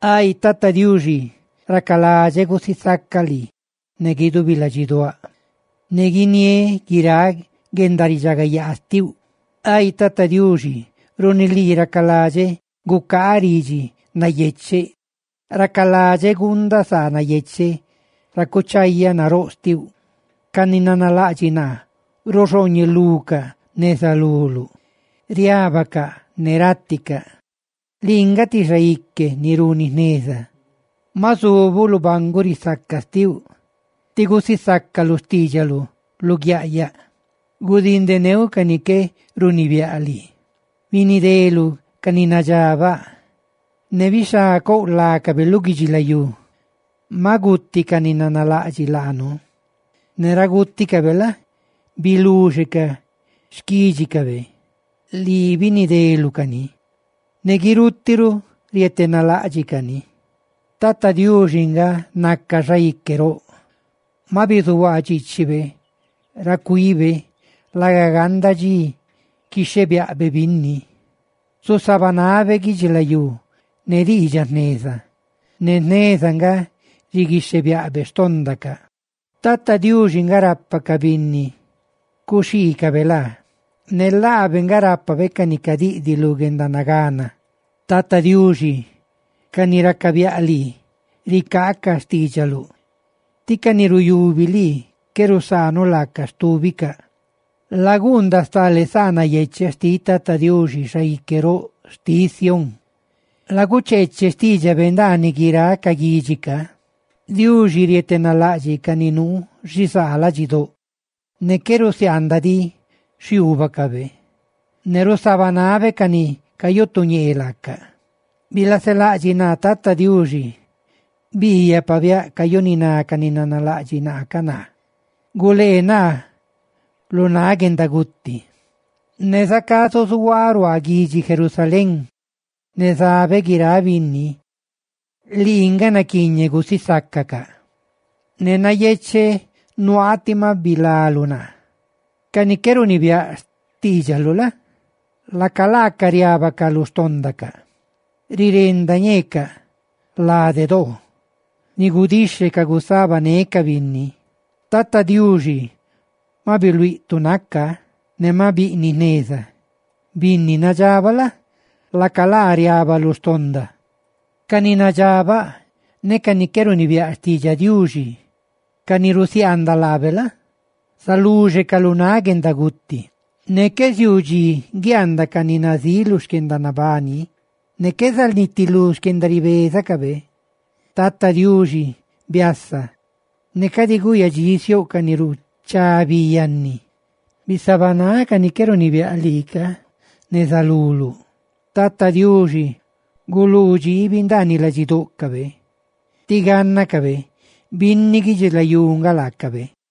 Ay Tata Diuxi, racaladxeꞌ gusisacaꞌ lii ne guidubi ladxiduáꞌ, ne guiniéꞌ guiráꞌ guendaridxagayaa xtiuꞌ. Ay Tata Diuxi, runi lii racaladxeꞌ gucaaꞌ ridxi nayecheꞌ, ¡racaladxeꞌ guundaꞌ saa yecheꞌ ra cuchayaꞌ naróꞌ xtiuꞌ! Ca ni nanalaꞌdxiꞌ naa ruxooñelucaꞌ neza luluꞌ; riábacaꞌ ne ráticaꞌ. Lii nga ti xaique ni runi jneza; ma zubuꞌ lu banguꞌ risaca xtiuꞌ, tí gusisácaluꞌ xtiidxaluꞌ luguiaꞌyaꞌ. Gudindeneuꞌ ca ni qué runibiáꞌ lii, binideluꞌ ca ni nadxabaꞌ, ¡ne bixhá couꞌ lácabe lu guidxilayú! Maꞌ guti ca ni nanalaꞌdxiꞌ laanu, ne ra gúticabe la? biluxe ca xquídxicabe; lii binideluꞌ cani, ne guirutiꞌ ruꞌ rietenalaꞌdxiꞌ cani. Tata Diuxi nga naca Xaique roꞌ; maꞌ bizuhuaa dxiichibe ra cuibe laga ganda dxi quixhebiaꞌbe binni; zusabanabe guidxilayú ne diidxaꞌ jneza, ne jneza nga quixhebiaꞌbe xtóndacaꞌ. Tata Diuxi nga rapa ca binni cuxhiicabe laa; ne laabe nga rápabe ca ni cadiꞌdiꞌ lu guendanagana. Tata Diuxi, ca ni racabiaꞌ lii, ricaacaꞌ xtiidxaluꞌ, tí ca ni ruyubi lii, qué rusaanuꞌ laacaꞌ stúbicaꞌ. Laguundaꞌ stale saa nayecheꞌ xtiꞌ Tata Diuxi, Xaique roꞌ xtiꞌ Sión; lagucheeche xtiidxabe ndaaniꞌ guiráꞌ ca guidxi ca. Diuxi rietenalaꞌdxiꞌ ca ni nuu xizaa ladxidóꞌ, ne qué rusiaandaꞌ diꞌ xhiuubacabe; ne rusabanabe ca ni cayutuñee laaca. Bilaselaꞌdxiꞌ naa Tata Diuxi, biiyaꞌ pabiáꞌ cayuniná ca ni nanalaꞌdxiꞌ naa ca. ¡Gulee naa lu náꞌ guendaguti! Ne zacá zuzuhuaaꞌ ruaa guidxi Jerusalén, ne zabeꞌ guiráꞌ binni, lii nga naquiiñeꞌ gusisácacaꞌ, ne nayecheꞌ nuaaꞌ tí maꞌ bilaluꞌ naa. Ca ni qué runibiáꞌ xtiidxaluꞌ la? laca laacaꞌ riábacaꞌ lu xtóndacaꞌ; rirenda ñeecaꞌ lade doo ni gudixhecaꞌ gusabanecaꞌ binni. Tata Diuxi maꞌ biluíꞌ tu naca; ¡ne maꞌ biꞌniꞌ jneza! Binni nadxabaꞌ la? laca laa riaaba lu xtonda. Ca ni nadxabaꞌ ne ca ni qué runibiáꞌ xtiidxaꞌ Diuxi, ca ni rusiaandaꞌ laabe la? zaluxecaꞌ lu náꞌ guendaguti; ne qué ziuu dxi guiaandaꞌ ca ni nazíꞌ xquendanabani, ne qué zanitilú guendaribeza xtícabe. Tata Diuxi, biasa; ne cadi guyadxisiouꞌ ca ni ruchá bi yanni; ¡bisabanáꞌ ca ni qué runibiáꞌ lii ca, neza luluꞌ! Tata Diuxi, guluu dxiibi ndaaniꞌ ladxidóꞌcabe, ¡tí gánnacabe binni guidxilayú nga laacabe!